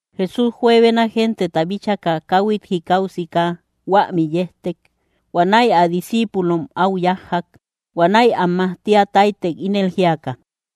Jesús juebena genteta bíchaka, káhuit jikau siika huämi yejtek. Huanäi ä discíipulom áu yájjak. Huanäi am majtia táytek, ínel jíaka: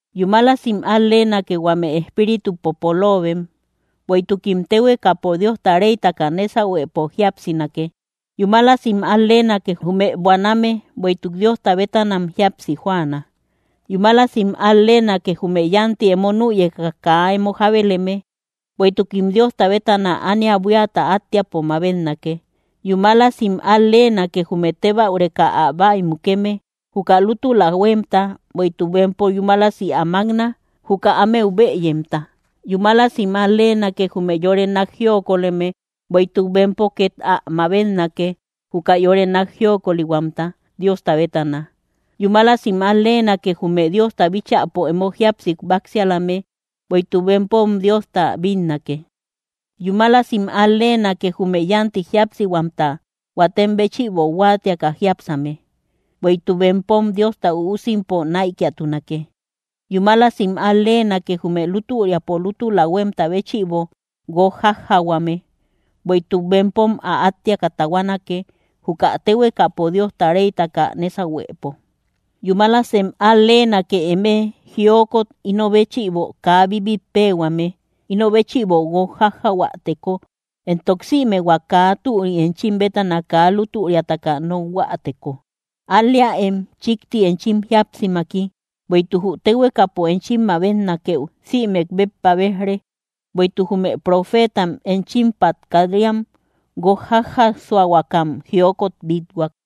—Yúmalasim al-leenake, huame espíritupo poloobem, bueïtukim téhuekapo Diosta réytaka nésahuepo jíapsinake. ’Yúmalasim al-leenake, jume buaname, bueïtuk Diosta bétanam jíapsi jóaana. ’Yúmalasim al-leenake, jume yánti emo nüyeka kaa emo jábeleme, bueïtukim Diosta bétana ania buíata attiapo mabetnake. ’Yúmalasim al-leenake, jume tebäureme entok ä bäimukeme, juka lútula huémta, bueïtuk bempom yúmalasi ä mákna, juka ámeu bëyemta. ’Yúmalasim al-leenake, jume yore nák jiokoleme, bueïtuk bempo két ä mabetnake, juka yore nák jiokolihuamta Diosta bétana. ’Yúmalasim al-leenake, jume Diosta bíchäpo emo jíapsi báksialame, bueïtuk bempom Diosta bínnake. ’Yúmalasim al-leenake, jume yánti jíapsihuamta huatem béchïbo huáatiaka jíapsame, bueïtuk bempom Diosta üusimpo näikiatunake. ’Yúmalasim al-leenake, jume lútüriapo lútula huémta béchïbo guók jájjahuame, bueïtuk bempom ä áttiaka tahuanake, juka téhuekapo Diosta réytaka nésahuepo. ’Yumálasem al-leenake eme, jiokot ino béchïbo kaa bíbitpehuame, ino béchïbo guók jájjahuäteko entok sïme hua kaa türi enchim bétana kaa lútüriataka nokhuäteko. Al‑leäem chíkti enchim jíapsimaki, bueïtuk jü téhuekapo enchim mabetnakëu, sïmek béppa béj‑re, bueïtuk jume profeetam enchimpat kat‑riam, guók jájasuakam jiokot bít-huak.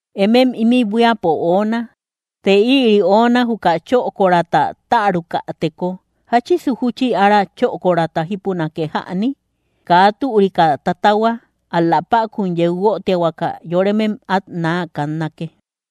’Emem ímï buíapo oona. Të ïri ona juka chökorata tärukäteko, ¿jáchisu júchi ára chökorata jípunake jäni? Kaa türika tatahua, ál‑la päkun yeu guötiahuaka, yoremem át naa kannake.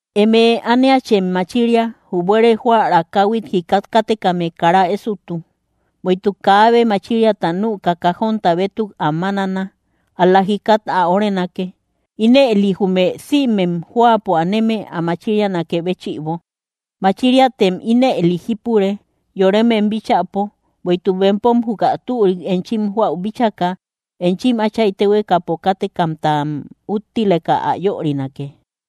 ’Eme, ániachem machiria. Jü buere jóära káhuit jikat kátekame kara ésotu. Bueïtuk kaabe machiriata nüka kajonta bétuk ä mámana, ál‑la jikat ä órenake, ínëli jume sïmem jóapo aneme ä machirianakë béchïbo. Machiriatem ínëli jípure, yoremem bíchäpo, bueïtuk bempom juka türik enchim joäu bíchaka, enchim Áchay téhuekapo kátekamtam úttileka ä yörinake.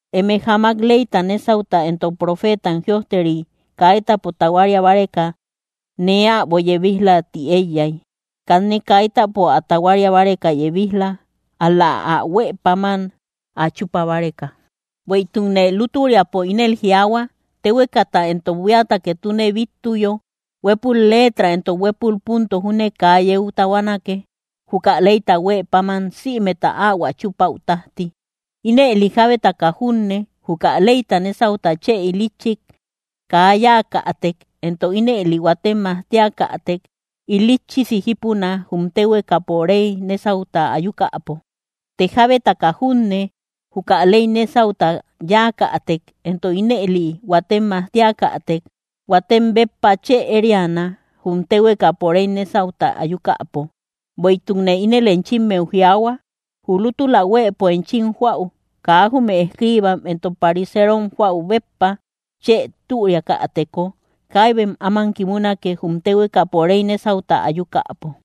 ’Eme jamak ley nésauta entok profeetam jïojteri kaitapo tahuaria báreka nee äbo yebij‑la ti éiyay. Kanne kaitapo ä tahuaria báreka yebij‑la, ál‑la ä huë páman ä chúpa báreka. Bueïtukne lútüriapo ínel jiaahua, téhuekata entok buíata ketune bíttuyo, huépul letra entok huépul punto júne kaa yeu tahuanake, juka leyta huë páman sïmeta áhuä chúpäu tájti. Ínëli jábetaka junne, juka leypo nésauta chë ilitchik kaa yáakätek, entok ínëli huatem majtiakätek, ilitchisi jípuna, jum téhuekapo réy nésauta ayukäpo. Të jábetaka junne, juka ley nésauta yáakätek, entok ínëli huatem majtiakätek, huatem béppa chë ériana, jum téhuekapo réy nésauta ayukäpo. Bueïtukne ínel enchimmeu jiaahua, jü lútula huëpo enchim joäu kaa jume escriibam entok pariserom joäu béppa chë türiakäteko, kaibem áman kimunake, jum téhuekapo réy nésauta ayukäpo.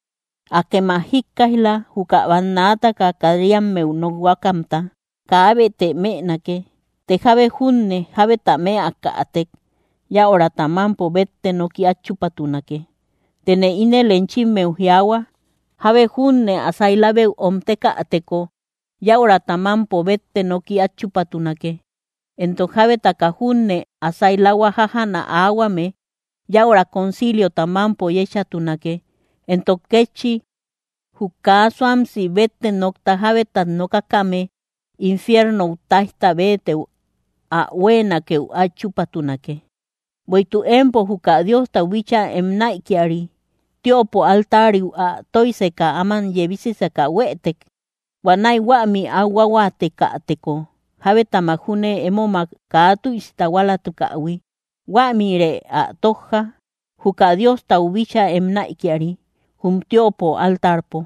’Akem ä jíkkaij‑la, juka bannaataka kat‑riammeu nokhuakamta: “Kaabetë mënake. Të jábe junne jábeta mëakätek, yäurata mámpo bétte noki át chúpatunake.” Tëne ínel enchimmeu jiaahua, jábe junne ä sailabeu öomtekäteko, yäurata mámpo bétte noki át chúpatunake; entok jábetaka junne ä sailahua jájana, aahuame yäura conciliota mámpo yéchatunake. Entok kétchi, jü kaa suamsi bétte nokta jábetat nokakame infiernou táijta béetëu ä huéenakeu át chúpatunake. ’Bueïtuk empo juka Diostau bíchaa em näikiari, tiöpo altariu ä tóijseka áman yebisiseka huëtek, huanäi huämi áu huáhuaatekäteko, jabetamak júne émomak kaa tüisi tahualatukähui, huämïrë ä tójja, juka Diostau bíchaa em näikiari jum tiöpo altarpo;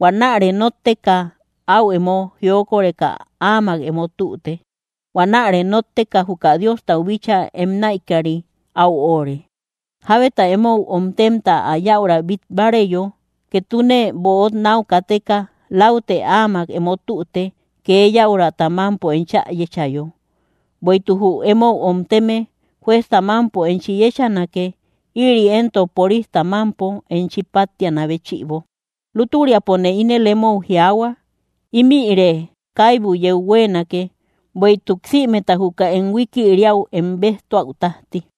huanäre nótteka áu emo jiokoreka áamak emo tüte. Huanäre nótteka, juka Diostau bíchaa em näikiari áu óóre. ’Jábeta emou omtemta ä yäura bít báareyo, ketune böot náu kateka läutë áamak emo tüte, kee yäurata mámpo enchä yéchayo; bueïtuk jü emou omteme juezta mámpo enchi yéchanake; íri éntok porista mámpo, enchi páttianä béchïbo. Lútüriapone ínel emou jiaahua, ímïre kaibu yeu huéenake, bueïtuk sïmeta juka em huikiriäu em béjtuäu tájti.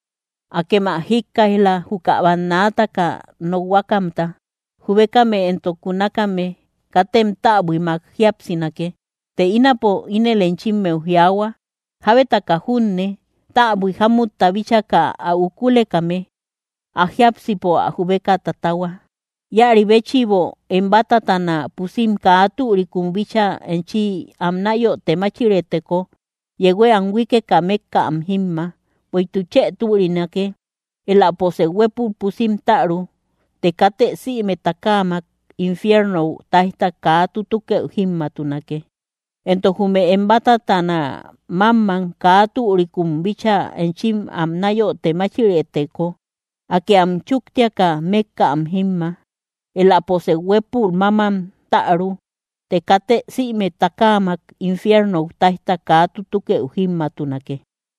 ’Akem ä jíkkaij‑la, juka bannaataka nokhuakamta: “Jubekame entok kunakame katem täbuimak jíapsinake.” Të ínapone ínel enchimmeu jiaahua jábetaka junne täbui jámutta bíchaka ä ukulekame, ä jiápsipo ä jubeka tatahua. ’Íäri béchïbo em bátatana puusim kaa türikum bíchaa enchi am náyote máchirëteko, yehuë am huíkeka mékka am jímma; bueïtuk chë türinake éläposë huépul pusim täru të katë sïme takaamak infiernou táijta kaa tutukëu jímmaatunake. Entok jume em bátatana mámmam kaa türikum bíchaa enchi am náyote máchirëteko, akë am chúktiaka mékka am jímma; éläposë huépul mámam täru, të katë sïme takaamak infiernou táijta kaa tutukëu jímmaatunake.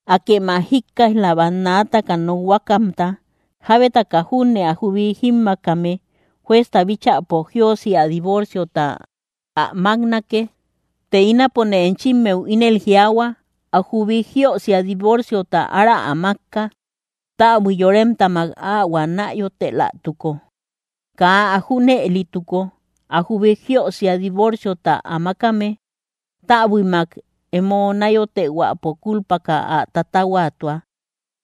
’Akem ä jíkkaij‑la, bannaataka nokhuakamta: “Jábetaka junne ä jubi jímmaakame juezta bíchäpo jiösia divorciota ä máknake.” Të ínapone enchimmeu ínel jiaahua ä jubi jiösia divorciota ára ä mákka, täbui yoremtamak áhuä náyotelatuko. Kaa ä junëlituko, ä jubi jiösia divorciota ä mákame, täbuimak emo náyotehuäpo kúlpaka ä tatahuatua;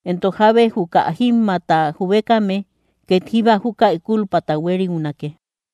entok jábe juka jímmaata jubekame két jíba júkäi kúlpata huériunake.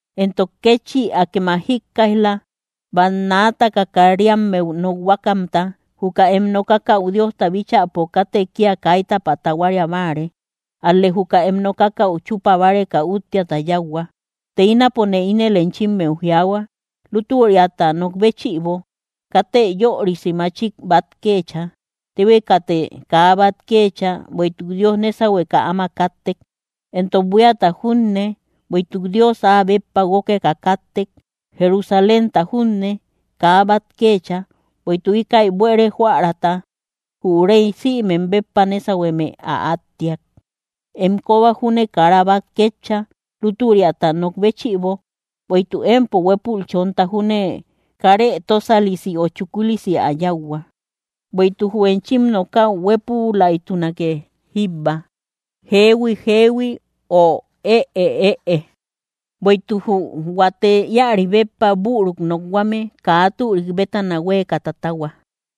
’Entok kétchi, akem ä jíkkaij‑la, bannaataka kat‑riammeu nokhuakamta: “Juka em nokakäu Diosta bíchäpo katë kía kaitapä tahuaria báare; ál‑lë juka em nokakäu chúpa báreka úttiata yáuhua.” Të ínapone ínel enchimmeu jiaahua lútüriata nok béchïbo, katë yörisi machik bát kéecha. Téhuekatë kaa bát kéecha, bueïtuk Dios nésahueka áma káttek. Entok buíata junne, bueïtuk Dios áa béppa guókeka káttek; Jerusalénta júne kaa bát kéecha, bueïtuk íkäi buére jóäraata jü Réy sïmem béppa nésahueme, ä áttiak. Em kóba júne kara bát kéecha, lútüriata nok béchïbo, bueïtuk empo huépul chonta junne, karë tósalisi ö chukulisi ä yáuhua. Bueïtuk jü enchim nokäu huépülaytunake jíbba: “Jehui, jehui”, ö “Ëe, ëe”; bueïtuk jü huate íäri béppa büruk nokhuame, kaa türik bétana huéeka tatahua.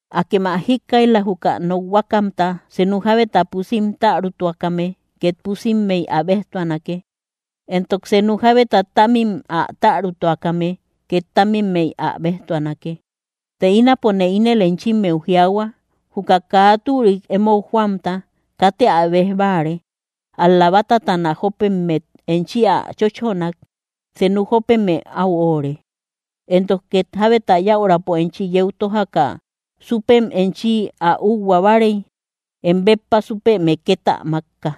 ’Akem ä jíkkaij‑la, juka nokhuakamta: “Senu jábeta pusim tärutuakame két pusimmey ä béjtuanake; entok senu jábeta támim ä tärutuakame két támimmey ä béjtuanake.” Të ínapone ínel enchimmeu jiaahua: Juka kaa türik emou joamta, katë ä béj báare; ál‑la bátatana jópemmet enchi ä chóchonak, senu jópeme áu óóre. Entok két jábeta yäurapo enchi yeu tójaka súpem enchi ä úhua báarey, em béppa súpeme két ä mákka.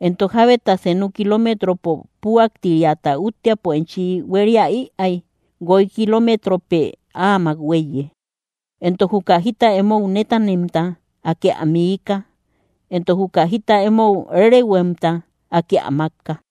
Entok jábeta senu kilometropo püaktiriata úttiapo enchi huéria ïaay, guoy kilometropë áamak huéiye. Entok juka jita emou nétanemta, Akë ä miika; entok juka jita emou rerehuemta, Akë ä mákka.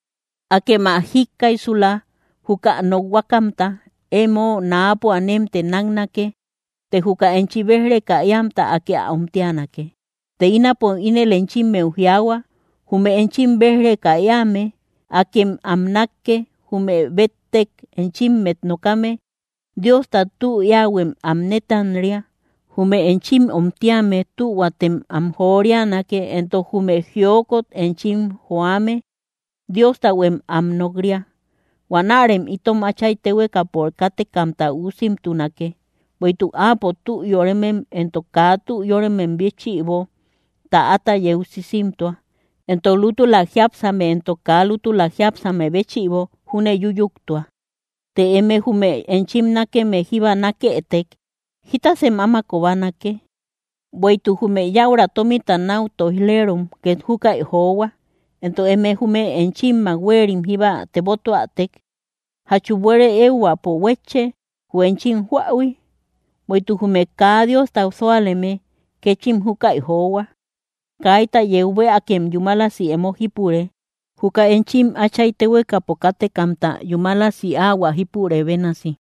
’Akem ä jíkkaijsula, juka nokhuakamta: “Emo náapo anemtë náknake, të juka enchi béj‑reka éamta, Akë ä omtianake.” Të ínapone ínel enchimmeu jiaahua: Jume enchim béj‑reka éame, akem am nákke; jume béttek enchimmet nokame, Diosta tü éähuem am nétanria, jume enchim omtíame tühuatem am jorianake; entok jume jiokot enchim joame, Diostahuem am nok‑ria. Huanärem itom Áchay téhuekapo kátekamta üusimtunake, bueïtuk Áapo tü yóremem entok kaa tü yóremem béchïbo, täata yeu sisimtua; entok lútula jiápsame entok kaa lútula jiápsame béchïbo júne yúyuktua. Të eme jume enchim nákeme jíba nákëtek, ¿jitasem áma kobanake? Bueïtuk jume yäura tómita náu tóij‑leerom két júkäi johua. Entok eme jume enchimmak huerim jíba tebotuätek, ¿jachu buére éehuäpo huétche, jü enchim joähui? Bueïtuk jume kaa Diosta súaleme, kéchim júkäi johua. Kaita yeu bëakem yúmalasi emo jípure, juka enchim Áchay téhuekapo kátekamta yúmalasi áhuä jípurë bénasi.